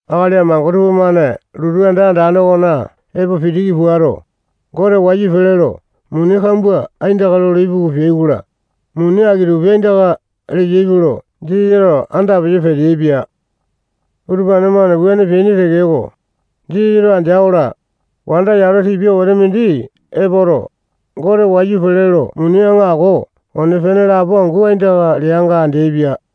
Akali amango tupamane lotu anda andane okona epo pitiki puato, Gote wayu pele lo muni kambua aindaka lolo ipuku peai-kola, muni aki-tupi aindaka leyaipe lo Jisasato anda peyo peteaipia. Utupane-mane wuane peaini tekeko, Jisasato andea-kola, wanda yalo tipia wete mindi epoto, Gote wayu pele lo muni aŋako one-pene lapo angu aindaka leanga andeaipia.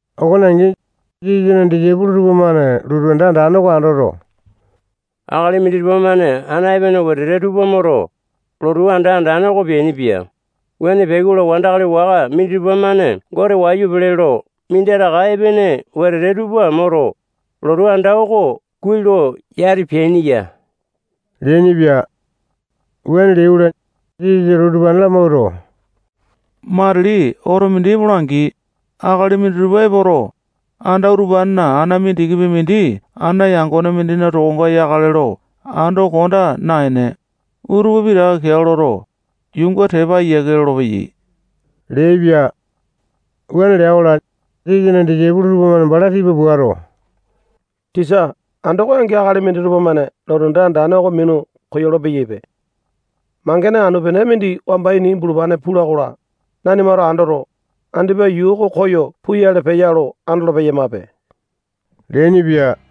Okone angi, Jisasana disaipolo tupamane lotu anda andane oko andoto, akali minditupa-mane ana epene wetete tupa moto, lotu anda andane oko peainipia. Wuane peai-kola, wandakali waka minditupa-mane Gote wayu pele lo minditaka epene wetete tupa moto, lotu anda oko kuai lo yati peaini ya leainipia. Wuane leai-kola, Jisasato utupane lamawuato, matili oto mindi epola-angi, akali minditupa epoto, anda utupanena ana mindikipi mindi ana yangone mindina tokonga yakale lo ando konda naene, utupa pitaka keao loto, yuunga tepa ayiake lolopeyai leaipia. Wuane lea-kola, Jisasana disaipolo tupamane bala tipa puato, tisa, andoko angi akali minditupa-mane lotu anda andane oko minu koyolo-peyaipe. Mangene anu-pene mindi wamba ini bulupane pula-kola, nanimato andoto, andipa yuu oko koyo puyale peya lo andolo-peyamape leainipia.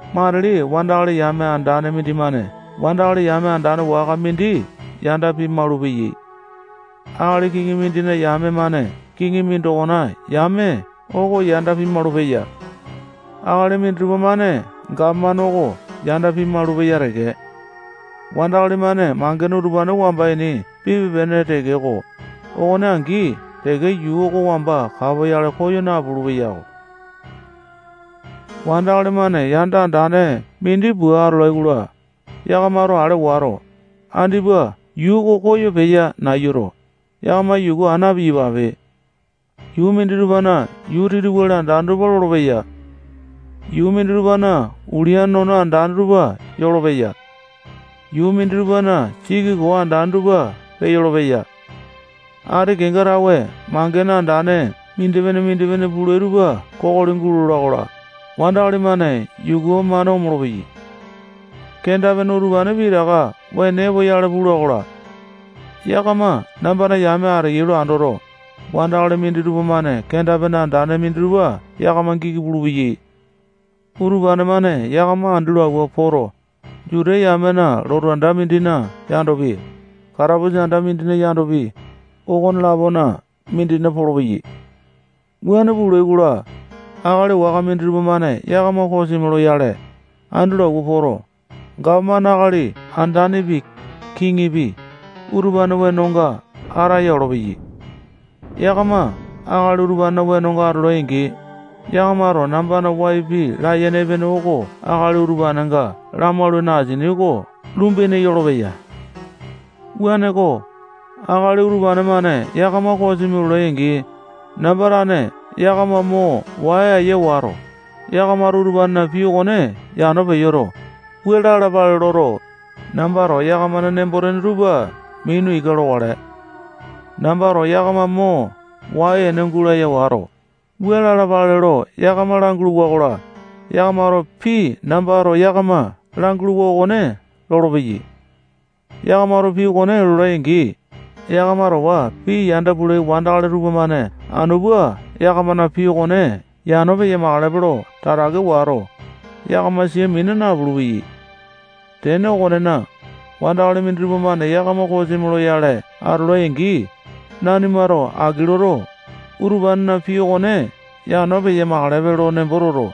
Matili wandakali yame andane mindimane wandakali yame andane waka mindi yanda pimaulu-peya. Akali kiŋi mindina yame-mane kiŋi mindokona yame oko yanda pimaulu-peya. Akali minditupa-mane gapomane oko yanda pimaulu-peya teke. Wandakali-mane mangene utupane wamba ini pipe-pene tekeko, okone angi teke yuu oko wamba kapoyale koyo napulu-peyako. Wandakali-mane yanda andane mindi pua atolai-kola, yakamato ale wato, andipa yuu oko koyo peya nayuto, yakama yuku aa na-piyapape. Yuu minditupana yuu titiwali andane tupa lolopeya. Yuu minditupana ulia nono andane tupa yolopeya. Yuu minditupana siki koo andane tupa peyolo-peya. Ati kenga tawe mangene andane mindipene-mindipene pulai tupa kokoli gulola-kola, wandakali-mane yuku-mane omolo-peyai. Kenda-pene utupane pitaka wene epoyale pula-kola, yakama nambana yame ateyai lo andoto, wandakali minditupa-mane kenda-pene andane minditupa yakama giki pulupeyai. Utupane-mane yakama andi lo awua poto, Juta yamena lotu anda mindina yandopi, katapusa anda mindina yandopi, okone-lapona mindina polopeyai. Wuane pulai-kola, akali waka minditupa-mane yakama kosimi loyale, andi lo awua poto, gapomane akali andanepi, kiŋipi, utupanena wenonga ataya olopeyai. Yakama akali utupanena wenonga atolai-angi, yakamato nambana wai pii layene epene oko akali utupanenga lamaulane asini oko lumbu ene yolopeya. Wuaneko, akali utupane-mane yakama kosimi lolai-angi, namba tane yakama mo wai aya wato, yakamato utupanena pii okone yano peyoto, wua lalapale loto, nambato yakamana nembo-tene tupa mina ika lokale. Nambato yakama mo wai-ene gulaya wato, wua lalapale lo yakama langulu-wakola, yakamato pii nambato yakama languluwa okone lolopeyai. Yakamato pii okone lolai-angi, yakama towa pii yanda pulai wandakali tupamane anu pua yakamana pii okone yano peya-makalepe lo tatake wato, yakama sia mina napulu-peyai. Tene okonena, wandakali minditupa-mane yakama kosimi loyale atolai-angi, nanimato aki loto, utupanena pii okone yano peya-makalepe nembo toto,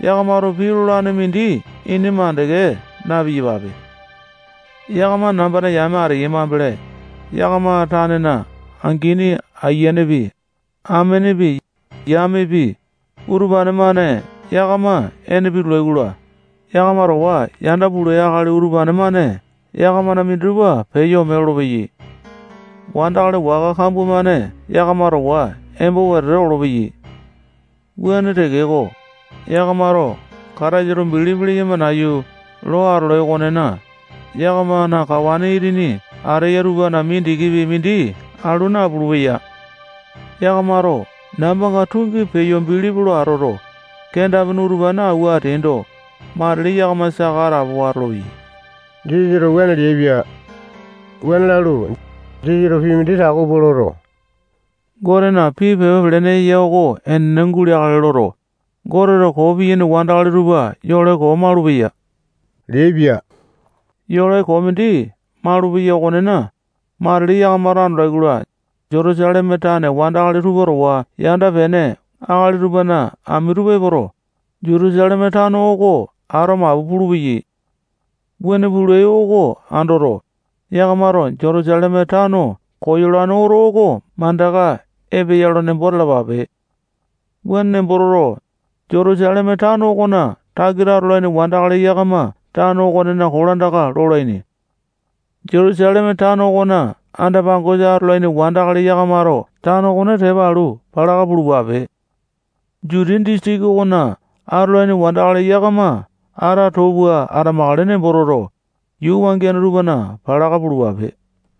yakamato pii lolane mindi ini mandeke na-piyapape. Yakama nambana yame ateyai mambele, yakama tanena angini ayianepi, amenepi, yamepi, utupane-mane yakama ene pitulai-kola, yakama towa yanda pulai akali utupane-mane yakamana minditupa peyo ome lolopeyai. Wandakali waka kambua-mane yakama towa embo wetete olopeyai. Wuane tekeko, yakamato Kataisa bilipi leyama nayu lo atolai okonena, yakamana kawa itini ateya tupana mindikipi mindi alu napulu-peya. Yakamato nambanga tungi peyo bilipi lo atoto, kenda-pene utupane awua ateaindo, matili yakama saka atapowa atolopeyai. Jisasato wuane leaipia. Wuane lalu, Jisasato pii mindi tako pua loto, Gotena pii pepa pelene eya oko enene guleakale loto, Goteto koo piyaini wandakali tupa yole koo maulupeya leaipia. Yole koo mindi malupeya okonena, matili yakamato andolai-kola, Jutusaleme tane wandakali tupa towa yanda-pene akali tupana ami tupa epoto, Jutusaleme tano oko ato mapu pulupeyai. Wuane pulai oko andoto, yakamato Jutusaleme tano koyolane oto oko mandaka epeya nembo talapape. Wuane nembo toto, Jutusaleme tano okona takita atolaini wandakali yakama tano okonena kolandaka lolaini. Jutusaleme tano okona anda-pangosa atolaini wandakali yakamato tano okone tepa alu, palaka pulupape. Jutiya disitiki okona atolaini wandakali yakama ata too pua atamakale nembo toto, yuu wangiane tupana palaka pulupape.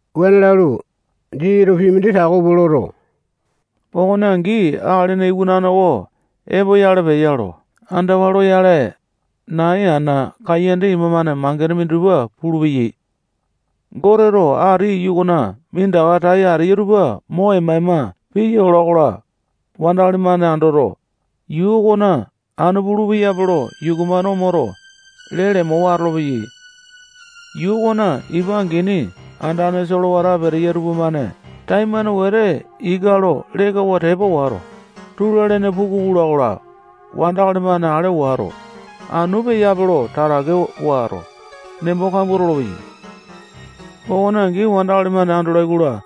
Wuane lalu, Jisasato pii mindi tako pua loto, okone angi Akalina Iwanane oko epoyale peya lo andawa loyale, nai, ana, kaiyanda ima-mane mangene minditupa pulupeyai. Goteto ati iyu okona minditaka tai ateya tupa mo ema-ema piya ola-kola, wandakali-mane andoto, yuu okona anu pulu-peyape lo yuku-mane omoto, lee lemowa atolopeyai. Yuu okona ipa angini andane solewata peteya tupamane taimane wete ika loto, lekawa tepa ola-kola, tula-lene puku pula-kola, wandakali-mane ale wato, anu peyape lo tatake wato, nembo kambua tolopeyai. Okone angi, wandakali-mane andolai-kola,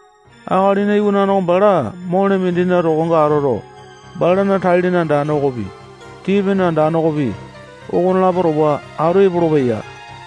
Akalina Iwanane oko bala mole mindina tokonga atoto, balana tai-lene andane okopi, tii-pene andane okopi, okonelapo towa atu epolopeya.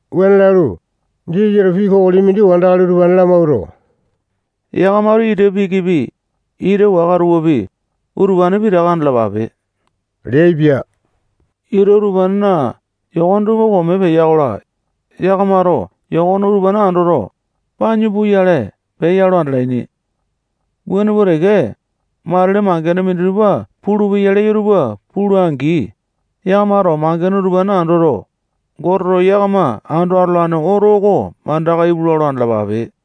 Wuane lalu, Jisasato pii kokoli mindi wandakali utupane lamawuato, yakamato ita pikipi, ita waka tupapi, utupane pitaka andalapape leaipia. Ita utupanena yokone tupa kome peya-kola, yakamato yokone utupane andoto, panyu puyale peya lo andalaini. Wuane pua teke, matili mangene minditupa pulupeya leyo tupa pulai-angi, yakamato mangene utupane andoto, Goteto yakama ando atolane oto oko mandaka ipulua lo andalapape.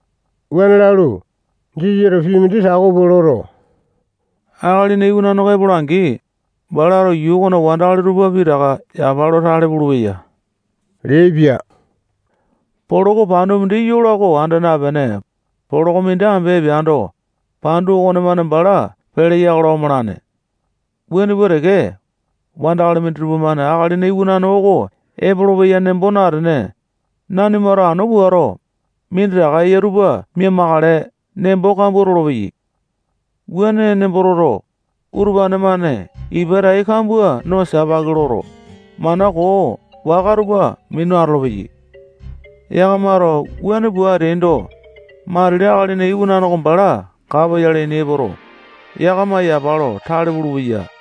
Wuane lalu, Jisasato pii mindi tako pua loto, Akalina Iwanane oko epola-angi, balato yuu okona wandakali tupa pitaka yapa lo tale pulupeya leaipia. Poloko pandu mindi yola oko anda napene, poloko mindi ambe epeando, pandu okonemane bala peleya-kola, omalane. Wuane pua teke, wandakali minditupa-mane Akalina Iwanane oko epolopeya nembo natene, nanimato anu puato, minditaka eya tupa mia-makale nembo kambua tolopeya. Wuane nembo toto, utupane-mane ipa tai kambua no sipaki loto, mana koo waka tupa minu atolopeyai. Yakamato wuane pua ateaindo, matili Akalina Iwanane oko bala kapoyale ini epoto, yakama yapa lo tale pulupeya.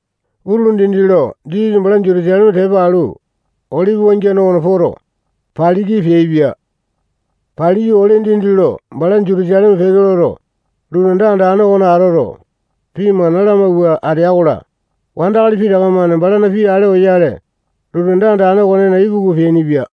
Utulu dindi lo Jisasa bala Jutusaleme tepa alu, Olipi wangiane okona poto, paliki peaipia. Paliyu, ole dindi lo bala Jutusaleme peke loto, lotu anda andane okona atoto, pii mana lamawua atea-kola, wandakali pitaka-mane balana pii ale oyale, lotu anda okonena ipuku peainipia.